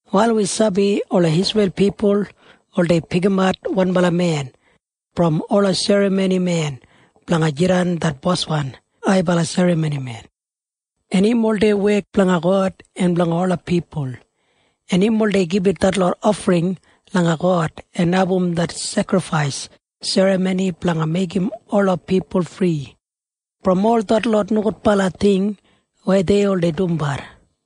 Wal wi sabi ola Isreil pipul oldei pikimat wanbala men brom ola serramonimen blanga jidan det boswan haibala serramonimen. En im oldei wek blanga God en blanga ola pipul, en im oldei gibit detlot ofring langa God en abum det sekrifais serramoni blanga meigim ola pipul fri brom ol detlot nogudbala ting weya dei oldei dumbat.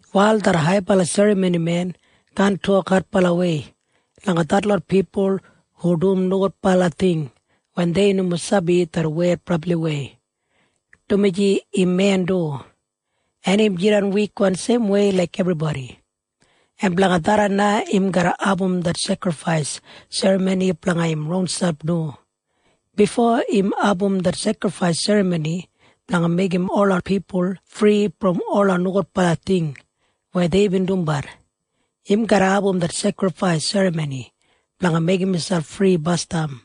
Wal det haibala serramonimen kaan tok adbalawei langa detlot pipul hu dum nogudbala ting wen dei nomo sabi det wed brabliwei, dumaji im men du, en im jidan wikwan seimwei laik ebribodi, en blanga tharran na im garra abum det sekrifais serramoni blanga im ronselp du. Bifo im abum det sekrifais serramoni blanga meigim ola pipul fri brom ola nogudbala ting weya deibin dumbat, im garra abum det sekrifais serramoni blanga meigim miselp fri basdam.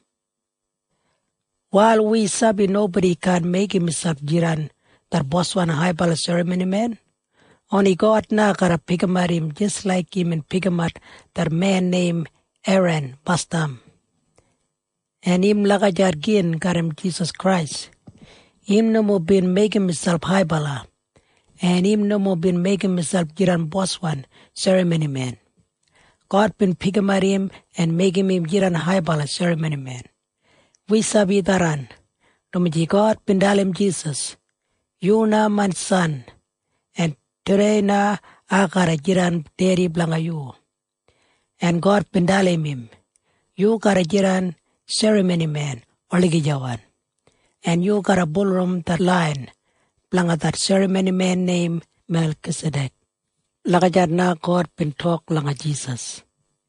Wal wi sabi nobodi kaan meigim miselp jidan det boswan haibala serramonimen. Oni God na garra pikimat im jis laik imbin pikimat det men neim Eran basdam. En im lagijat gin garram Jisas Krais. Im nomo bin meigim miselp haibala, en im nomo bin meigim miselp jidan boswan serramonimen. God bin pikimat im en meigim im jidan haibala serramonimen. Wi sabi tharran, dumaji God bin dalim Jisas, “Yu na main San, en tudei na ai garra jidan Dedi blanga yu.” En God bin dalim im, “Yu garra jidan serramonimen olagijawan, en yu garra bulurrum det lain blanga det serramonimen neim Melkisadek.” Lagijat na God bin tok langa Jisas.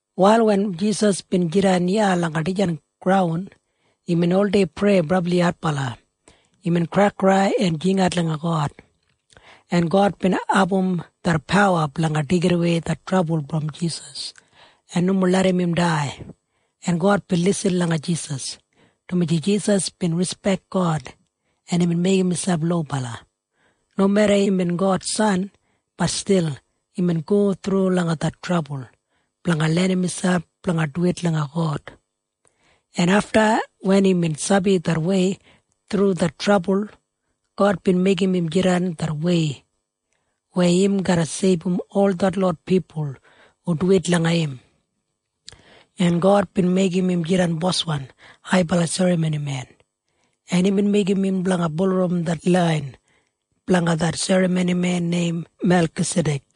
Wal wen Jisas bin jidan iya langa dijan graun, imbin oldei prei brabli adbala. Imbin kraikrai en jingat langa God, en God bin abum det pawa blanga deigidawei det trabul brom Jisas en nomo larram im dai, en God bin lisin langa Jisas, dumaji Jisas bin rispek God en imbin meigim miselp lobala. Nomeda imbin God San, bat stil imbin go thru langa det trabul blanga lenim miselp blanga duwit langa God, en afta wen imbin sabi det wei thru det trabul, God bin meigim im jidan det wei weya im garra seibum ol detlot pipul hu duwit langa im. En God bin meigim im jidan boswan haibala serramonimen, en imbin meigim im blanga bulurrum det lain blanga det serramonimen neim Melkisadek.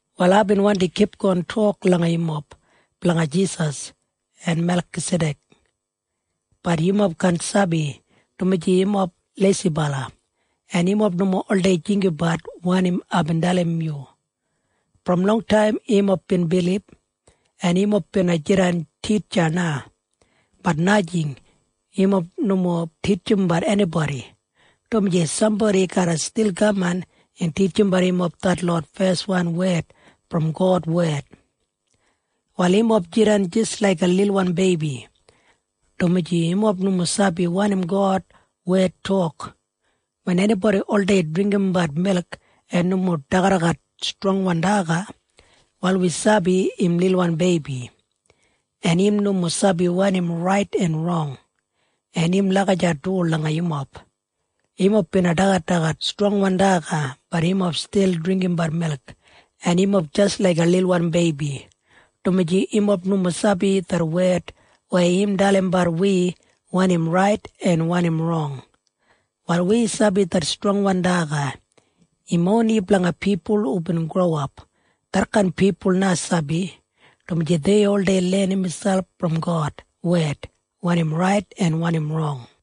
Wal aibin wandi kipgon tok langa yumob blanga Jisas en Melkisadek. Bat yumob kaan sabi, dumaji yumob leisibala, en yumob nomo oldei jinggabat wanim aibin dalim yu. Brom longtaim yumob bin bilib, en yumob bina jidan titja na. Bat najing. Yumob nomo titjimbat enibodi, dumaji sambodi garra stil kaman en titjimbat yumob detlot feswan wed brom God wed. Wal yumob jidan jis laiga lilwan beibi, dumaji yumob nomo sabi wanim God wed tok. Wen enibodi oldei dringgimbat milk en nomo dagadagat strongwan daga, wal wi sabi im lilwan beibi, en im nomo sabi wanim rait en rong. En im lagijat du langa yumob. Yumob bina dagadagat strongwan daga. Bat yumob stil dringgimbat milk, en yumob jis laiga lilwan beibi, dumaji yumob nomo sabi det wed weya im dalimbat wi wanim rait en wanim rong. Wal wi sabi det strongwan daga im oni blanga pipul hubin growap. Detkain pipul na sabi, dumaji dei oldei lenim miselp brom God wed wanim rait en wanim rong.